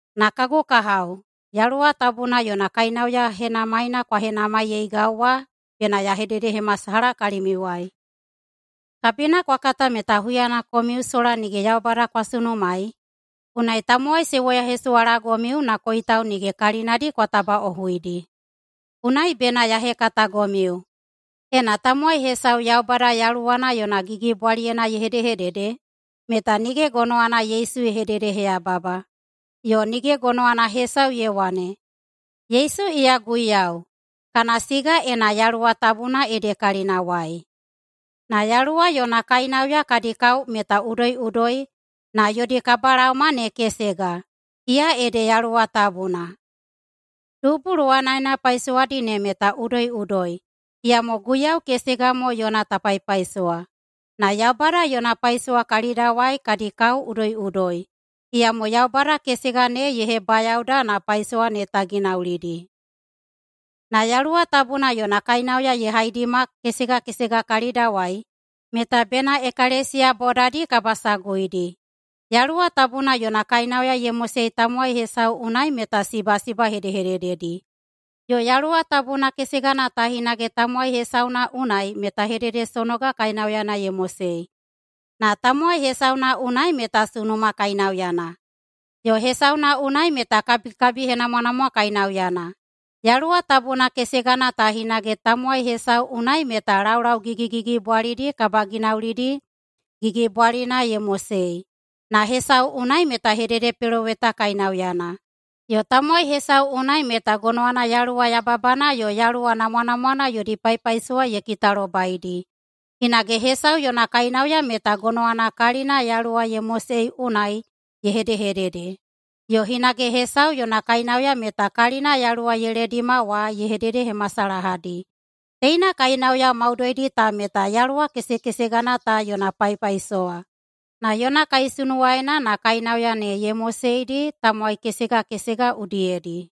Na kagu kahao, Yaluwa Tabuna yona kainauya henamaina kwa henamaiyeigau wa bena ya hededehemasalaha kalimiuwai. Kabina kwa kata meta huyana komiu sola nige Yaubada kwa sunumaei, unai tamowai se woyahesuwalagomiu na koitau nige kalinadi kwa tabaꞌohuidi. Unai bena ya hekatagomiu: Ena tamowai hesau Yaubada Yaluwana yona gigibwaliyena ye hedehedede, meta nige gonowana Yesu ye hededeheyababa. Yo nige gonowana hesau ye wane, “Yesu iya Guiyau,” kana siga ena Yaluwa Tabuna ede kalinawai. Na Yaluwa yona kainauya kadi kao meta udoiꞌudoi, na yodi kabalaoma ne kesega, iya ede Yaluwa Tabuna. Dubu luwanaena paisowadi ne meta udoiꞌudoi, iyamo Guiyau kesega mo yona ta paipaisowa. Na Yaubada yona paisowa kalidawai kadi kao udoiꞌudoi, iyamo Yaubada kesega ne ye hebayaoda na paisowa ne ta ginaulidi. Na Yaluwa Tabuna yona kainauya ye haidima kesega kesega kalidawai meta bena ekalesiya bodadi kabasaguidi. Yaluwa Tabuna yona kainauya ye mosei tamowai hesau unai meta sibasiba hedehedededi, yo Yaluwa Tabuna kesegana ta hinage tamowai hesauna unai meta hededesonoga kainauyana ye mosei, na tamowai hesauna unai meta sunuma kainauyana, yo hesauna unai meta kabikabihenamwanamwa kainauyana. Yaluwa Tabuna kesegana ta hinage tamowai hesau unai meta laulau gigigigibwalidi kabaginaulidi gigibwalina ye mosei, na hesau unai meta hededepeloweta kainauyana, yo tamowai hesau unai meta gonowana yaluwa yababana yo yaluwa namwanamwana yodi paipaisowa ye kitalobaidi. Hinage hesau yona kainauya meta gonowana kalina Yaluwa ye mosei unai ye hedehedede, yo hinage hesau yona kainauya meta kalina Yaluwa ye ledima wa ye hededehemasalahadi. Teina kainauya maudoidi ta meta Yaluwa kesekesegana ta yona paipaisowa, na yona kaisunuwayena na kainauya ne ye moseidi tamowai kesega kesega udiyedi.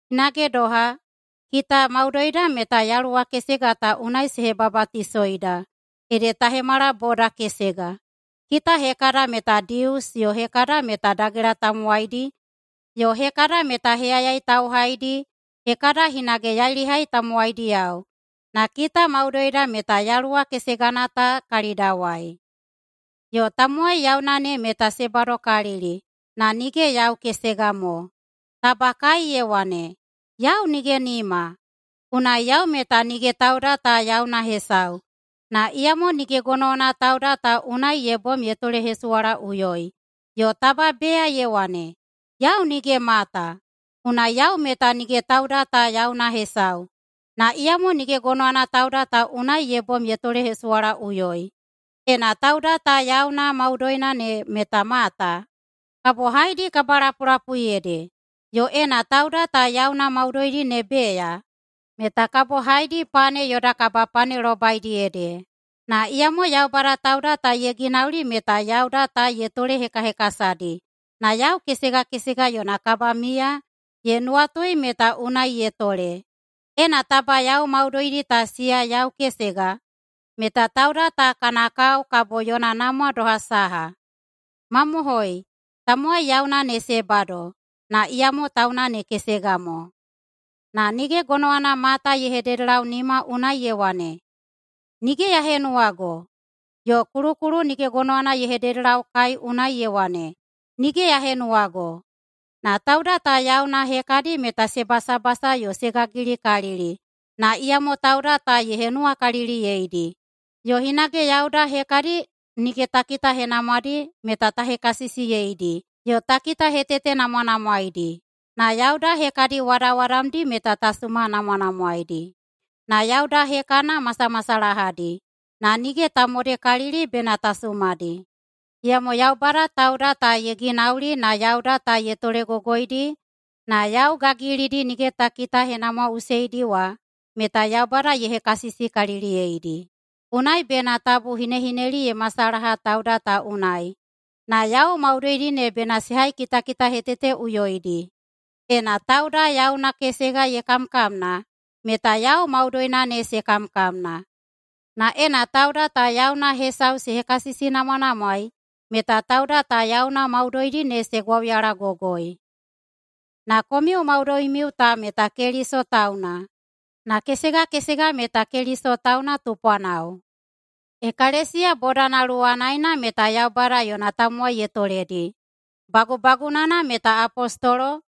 Hinage doha, kita maudoida meta Yaluwa kesega ta unai se hebabatisoida, ede ta hemala boda kesega. Kita hekada meta Dius yo hekada meta dagela tamowaidi yo hekada meta heyayai tauhaidi, hekada hinage yailihai tamowaidiyao, na kita maudoida meta Yaluwa kesegana ta kalidawai. Yo tamowai yauna ne meta se badokalili na nige yau kesega mo. Taba kae ye wane, “Yau nige nima, unai yau meta nige tauda ta yauna hesau.” Na iyamo nige gonowana tauda ta unai ye bom ye tolehesuwalaꞌuyoi. Yo taba beya ye wane, “Yau nige mata, unai yau meta nige tauda ta yauna hesau.” Na iyamo nige gonowana tauda ta unai ye bom ye tolehesuwalaꞌuyoi. Ena tauda ta yauna maudoina ne meta mata, kabo haedi kabalapulapui ede? Yo ena tauda ta yauna maudoina ne beya, meta kabo haedi pane yoda kabapanelobaidi ede? Na iyamo Yaubada tauda ta ye ginauli meta yauda ta ye tolehekahekasadi, na yau kesega kesega yona kabamiya ye nuwatui meta unai ye tole. Ena taba yau maudoidi ta siya yau kesega meta tauda ta kana kao kabo yona namwa doha saha? Mamohoi, tamowai yauna ne se bado, na iyamo tauna ne kesega mo. Na nige gonowana mata ye hededelau nima unai ye wane, “Nige ya henuwago”, yo kulukulu nige gonowana ye hededelau kae unai ye wane, “Nige ya henuwago.” Na tauda ta yauna hekadi meta se basabasa yo se gagilikalili na iyamo tauda ta ye henuwakaliliyeidi. Yo hinage yauda hekadi nige ta kitahenamwadi meta ta hekasisiyeidi yo ta kitahetetenamwanamwaeidi. Na yauda hekadi wadawadamdi meta ta sumanamwanamwaeidi. Na yauda hekana masamasalahadi na nige ta modekalili bena ta sumadi. Iyamo Yaubada tauda ta ye ginauli na yauda ta ye tolegogoidi na yau gagilidi nige ta kitahenamwaꞌuseidi wa meta Yaubada ye hekasisikaliliyeidi. Unai bena tabu hinehineli ye masalaha tauda ta unai, na yau maudoidi ne bena se haikitakitaheteteꞌuyoidi. Ena tauda yauna kesega ye kamkamna meta yau maudoina ne se kamkamna. Na ena tauda ta yauna hesau se hekasisinamwanamwaei meta tauda ta yauna maudoidi ne se gwauyalagogoi. Na komiu maudoimiu ta meta Keliso tauna, na kesega kesega meta Keliso tauna tupwanao. Ekalesiya bodana luwadiyena meta Yaubada yona tamowai ye toledi. Bagubagunana meta apostolo,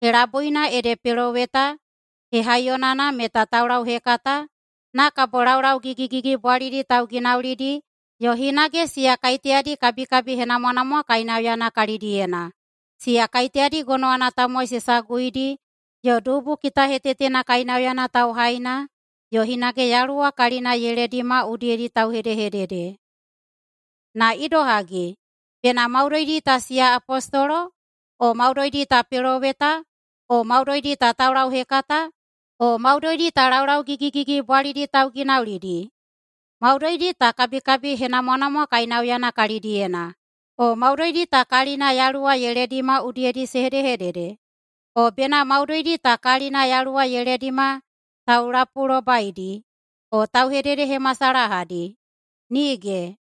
helabuina ede peloweta, hehaiyonana meta taulauhekata, na kabo laulau gigigigibwalidi tauginaulidi yo hinage siya kaiteyadi kabikabihenamwanamwa kainauyana kalidiyena, siya kaiteyadi gonowana tamowai se saguidi, yo dubu kitahetetena kainauyana tauhaina, yo hinage Yaluwa kalina ye ledima udiyedi tauhedehedede. Na idohagi, bena maudoidi ta siya apostolo, o maudoidi ta peloweta, o maudoidi ta taulauhekata, o maudoidi ta laulau gigigigibwalidi tauginaulidi? Maudoidi ta kabikabihenamwanamwa kainauyana kalidiyena, o maudoidi ta kalina Yaluwa ye ledima udiyedi se hedehedede? O bena maudoidi ta kalina Yaluwa ye ledima taulapulobaidi yo tauhededehemasalahadi? Nige!